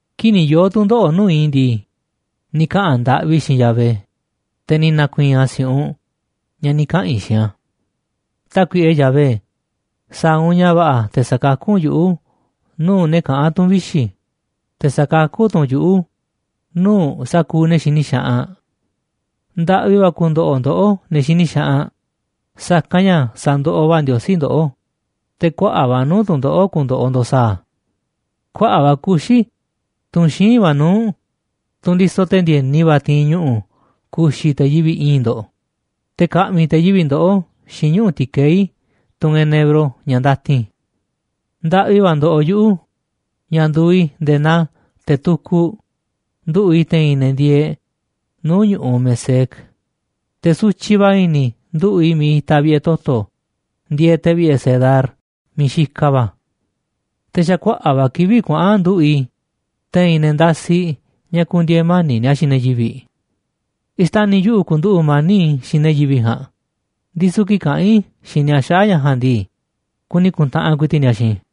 Kii̱ꞌ ni̱ yoo̱ tu̱ndoꞌo̱ꞌ nuu̱ꞌ i̱ ndii, ni̱ kaꞌa̱n ndaꞌvi i̱ xiinꞌ Yahvé, te̱ ni̱ na̱ku̱i̱i̱n a̱ si̱u̱ꞌunꞌ ña̱ ni̱ kaꞌa̱n i̱ xiinꞌ a̱. Tákuiꞌe Yahvé, sa̱a̱ u̱nꞌ ña̱ va̱ꞌa̱ te̱ sa̱kakú u̱nꞌ yuꞌu̱ nuu̱ꞌ ne̱ kaꞌán tu̱n vixi̱, te̱ sa̱kakú tu̱ u̱nꞌ yuꞌu̱ nuu̱ꞌ sa̱kuuꞌ ne̱ xini xaꞌanꞌ. Ndaꞌvi va̱ ku̱ndo̱ꞌo̱ ndoꞌó, ne̱ xini xaꞌanꞌ, sa̱kanꞌ ña̱ sa̱ndoꞌoꞌ va̱ Ndiosí ndoꞌó, te̱ kuaꞌa̱ꞌ va̱ nuu̱ꞌ tu̱ndoꞌo̱ꞌ ku̱ndo̱ꞌo̱ ndo̱ꞌ sa̱a̱ a̱. Kuaꞌa̱ꞌ va̱ kuxi̱, tunꞌ xíinꞌ va̱ nuu̱ꞌ, tunꞌ ndisoꞌ te̱ ndi̱e̱ni va̱ ti̱i̱n ñuꞌu̱ ku̱xi̱ te̱ yivi̱ꞌ i̱i̱nꞌ ndo̱ꞌ, te̱ ka̱ꞌmi̱ te̱ yivi̱ꞌ ndoꞌó xiinꞌ ñuꞌu̱ ti̱keí tunꞌ enebro ña̱ ndatin. Ndaꞌvi va̱ ndoꞌoꞌ yuꞌu̱ ña̱ nduuꞌ i̱ nde̱e̱ naa te̱ tukuꞌ, nduꞌu̱ꞌ i̱ te̱i̱n ne̱ ndieeꞌ nuu̱ꞌ ñu̱ꞌuꞌ Mesec, te̱ sutyiꞌ va̱ i̱ni̱ i̱ nduꞌu̱ꞌ i̱ miiꞌ itaꞌ vi̱ꞌe̱ toto̱ ndieeꞌ, te̱ vi̱ꞌe̱ Cedar miiꞌ xikaꞌ va̱. Te̱ xa̱ kuaꞌa̱ꞌ va̱ kivi̱ꞌ kuaꞌa̱n nduꞌu̱ꞌ i̱, te̱i̱n ne̱ ndasiꞌ ña̱ ku̱ndi̱e̱e̱ mani̱ꞌ ni̱a̱ xiinꞌ ne̱ yivi̱ꞌ. Xtani̱ yuꞌu̱ ku̱nduꞌu̱ꞌ mani̱ꞌ i̱ xiinꞌ ne̱ yivi̱ꞌ ja̱a̱nꞌ, ndisu̱ kii̱ꞌ kaꞌán i̱ xiinꞌ ni̱a̱ xaꞌa̱ꞌ ña̱ ja̱a̱nꞌ ndii, kuni ku̱ntaꞌanꞌ ku̱i̱ti̱ꞌ ni̱a̱ xiinꞌ i̱.